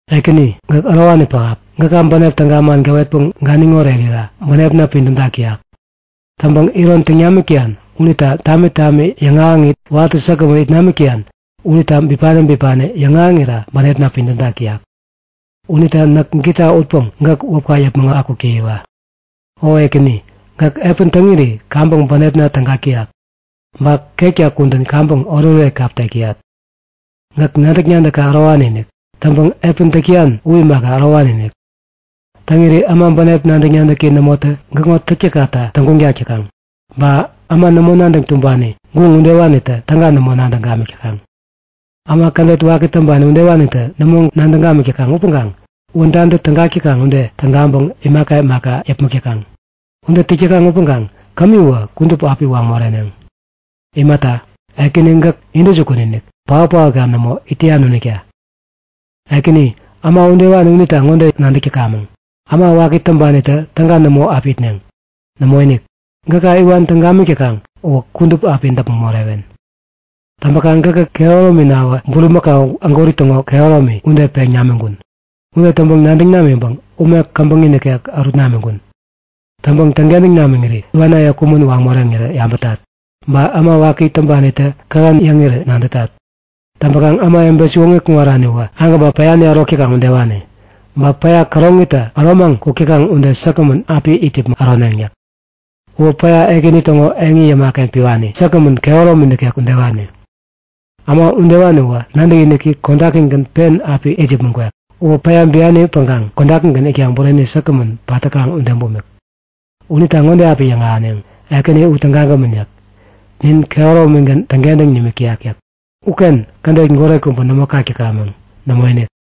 Ekäni, gäk ärowani pähap. Gäka bänep täga man gäwetpäŋ ganiŋ orerira bänepna pidämtak täyak. Täŋpäŋ iron täŋ namik täyan unita tami tami yäŋahäŋit watä säkgämän it namik täyan unita bipani bipani yäŋahäŋira bänepna pidämtak täyak. Unita näk gita utpäŋ gäk wäpka yäpmäŋ akuk täyiwa. O Ekäni, gäk epän täŋiri kaŋpäŋ bänepna tägak täyak. Ba ketka kudän kaŋpäŋ oretoret kap tek täyat. Gäk nadäk-nadäkka ärowani-inik. Täŋpäŋ epän täk täyan u imaka, ärowani-inik. Täŋiri äma bänep nadäk-nadäki nämotä gäkŋo täktäkkata täŋguŋtak täkaŋ. Ba äma nämo nadäŋ tumbani, guŋ udewanitä täga nämo nadäŋ gamik täkaŋ. Äma kädet waki täŋpani udewanitä nämo nadäŋ gamik täkaŋ upäŋkaŋ wädantä tägak täkaŋ ude tägaŋpäŋ imaka imaka yäpmäk täkaŋ. Ude täk täkaŋ upäŋ kämiwä kudup api waŋ moreneŋ. Imata, Ekäni gäk intäjukun-inik, paot-paotka nämo it täyan unita. Ekäni, äma udewani unita ŋode nadäkamäŋ; Äma waki täŋpanitä täga nämo api itneŋ. Nämoinik! Gäka iwan täŋ gamik täkaŋ uwä kudup api däpmäŋ morewen. Täŋpäkaŋ gäkä kehärominawä bulimakau ägwäri täŋo kehäromi ude peŋ namiŋkun. Ude täŋpäŋ nadäŋ namiŋpäŋ ume käbäŋi nikek ärut namiŋkun. Täŋpäŋ täŋkentäŋ namiŋiri iwanaye kumän waŋ moreŋirä yabätat. Ba äma waki täŋpanitä kähän yäŋirä nadätat. Täŋpäkaŋ ämawebe siwoŋi kuŋaraniwä agäba päyani ärok täkaŋ udewani. Ba päya käroŋitä äromaŋ kuk täkaŋ ude säkgämän api it yäpmäŋ äroneŋ yäk. Uwä päya Ekäni täŋo eŋi yämaken piwani, säkgämän, kehäromi nikek udewani. Äma udewani uwä nadäkiniki kodakigän pen api it yäpmäŋ kwek. Uwä päya biani-päŋkaŋ kodakigän itkaŋ bureni säkgämän pat täkaŋ ude bumik. Unita ŋode api yäŋahäneŋ; Ekäni u tägagämän yäk. Nin kehäromigän täŋkentäŋ nimik täyak yäk. Uken kädet goret kubä nämo kak täkamäŋ. Nämoinik!